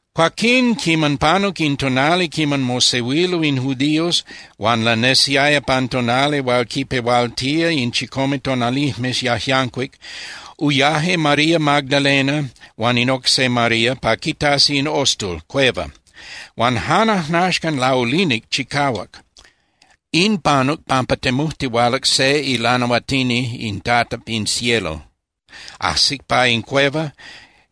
Cuaquín quiman panuc in tonali quiman mosehuilo in judíos huan lanesiaya pan tonali hual quinpehualtía in chicome tonalijmes yajyancuic, uyaje María Magdalena huan in oc se María pa quitasi in ostul (cueva). Huan jan ajnaxcan laulinic chicahuac. In panuc pampa temujtihualac se ilanahuatini in Tata pin cielo. Ajsic pa in cueva,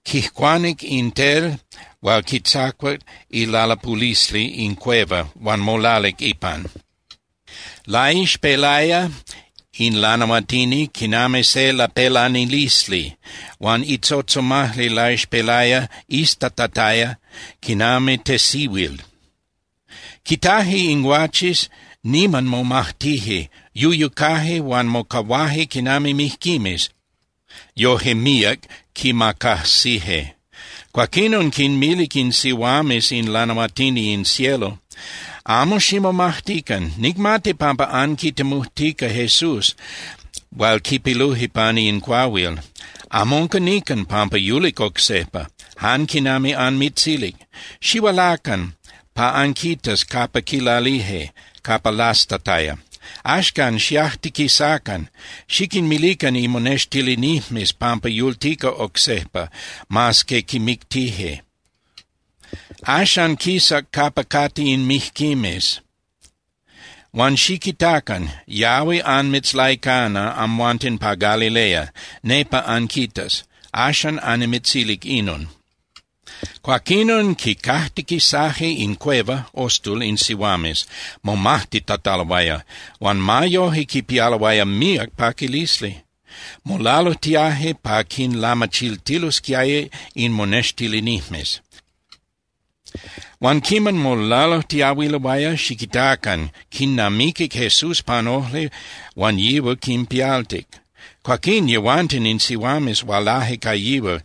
quijcuanic in tel hual quitzacuac ilalapulisli in cueva huan molalic ipan. Laixpelaya in lanahuatini quinami se lapelanilisli huan itzotzomajli laixpelaya iztatataya quinami tesihuil. Quitaje in guaches, niman momajtije, yuyucaje huan mocahuaje quinami mijquimes, yoje míac quimacajsije. Cuaquinon quinmilic in sihuames in ilanahuatini in cielo: —Amo ximomajtican. Nicmati pampa anquitemujtica Jesús hual quipiluje pani in cuahuil. Amo unca nican pampa yulic oc sejpa, jan quinami anmitzilic. Xihualacan pa anquitas capa quilalije, capa lastataya. Axcan, xiajtiquisacan, xiquinmilican imonextilinijmes pampa yultica oc sejpa, mas que quimictije. Axan quisac capa cate in mijquimes. Huan xiquitacan. Yahui anmitzlaicana amhuanten pa Galilea, nepa anquitas. Axan annimitzilic inon. Cuaquinon quicajtiquisaje in cueva (ostul) in sihuames momajtitataloaya, huan ma yoje quipialoaya míac paquilisli. Molalujtiaje pa quinlamachiltilosquiaya in monextilinijmes. Huan quiman molalujtiahuiloaya, xiquitacan, quinnamiquic Jesús pan ojli huan yihual quinpialtic. Cuaquín yehuanten in sihuames hualaje ca yihual,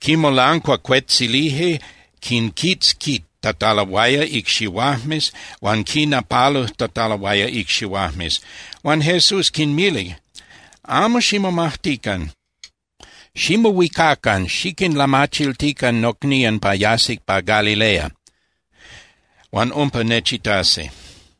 quimolancuacuetzilije quinquitzquitataloaya icxihuajmes huan quinnapalujtataloaya icxihuajmes. Huan Jesús quinmilic: —Amo ximomajtican. Ximohuicacan xiquinlamachiltican nocnían pa yasi pa Galilea, huan umpa nechitasi.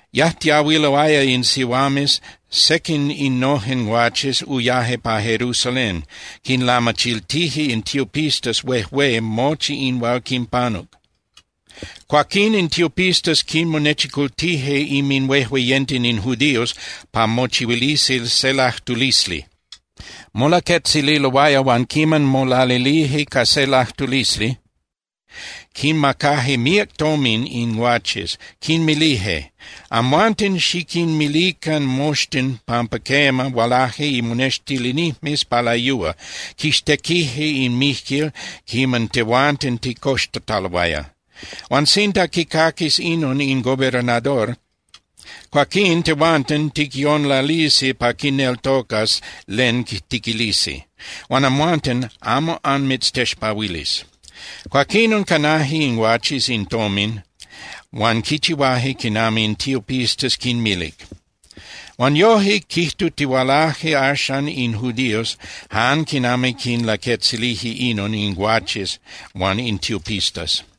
Yajtiahuiloaya in sihuames, sequin innojen guaches uyaje pa Jerusalén, quinlamachiltije in tiopistas huejué mochi in hual quinpanuc. Cuaquín in tiopistas quinmonechicultije inminhuejueyenten in judíos pa mochihuilisi se lajtulisli. Molaquetzililoaya huan quiman molalilije ca se lajtulisli, quinmacaje míac tomin in guaches. Quinmilije: —Amhuanten xiquinmilican moxtin pampa quema, hualaje imonextilinijmes pa layúa, quixtequije in mijquil quiman tehuanten ticoxtataloaya. Huan sinda quicaquis inon in gobernador, cuaquín tehuanten ticyonlalisi pa quineltocas len tiquilisi, huan amhuanten amo anmitztexpahuilis. Cuaquinon canaje in guaches in tomin huan quichihuaje quinami in tiopistas quinmilic. Huan yoje quijtutihualaje axan in judíos jan quinami quinlaquetzilije inon in guaches huan in tiopistas.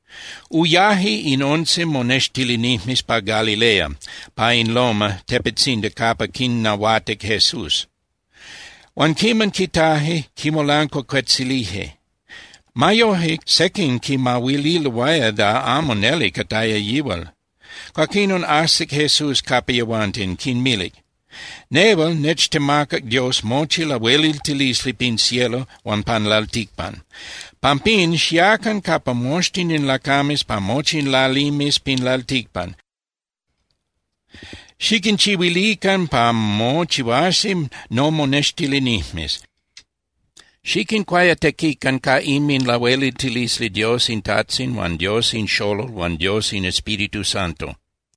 Uyaje in once monextilinijmes pa Galilea pa in loma (tepetzindi) capa quinnahuatic Jesús. Huan quiman quitaje, quimolancuacuetzilije. Ma yoje, sequin quimahuililoaya da amo neli cataya yihual. Cuaquinon ajsic Jesús capa yehuanten, quinmilic: —Nehual nechtemacac Dios mochi lahueliltilisli pin cielo huan pan lalticpan. Pampín, xiacan capa moxtin in lacames pa mochi in lalimes pin lalticpan, xiquinchihuilican pa mochihuasi nomonextilinijmes. Xiquincuayatequican ca inminlahueliltilisli Dios in Tajtzin huan Dios in Xolol huan Dios in Espíritu Santo.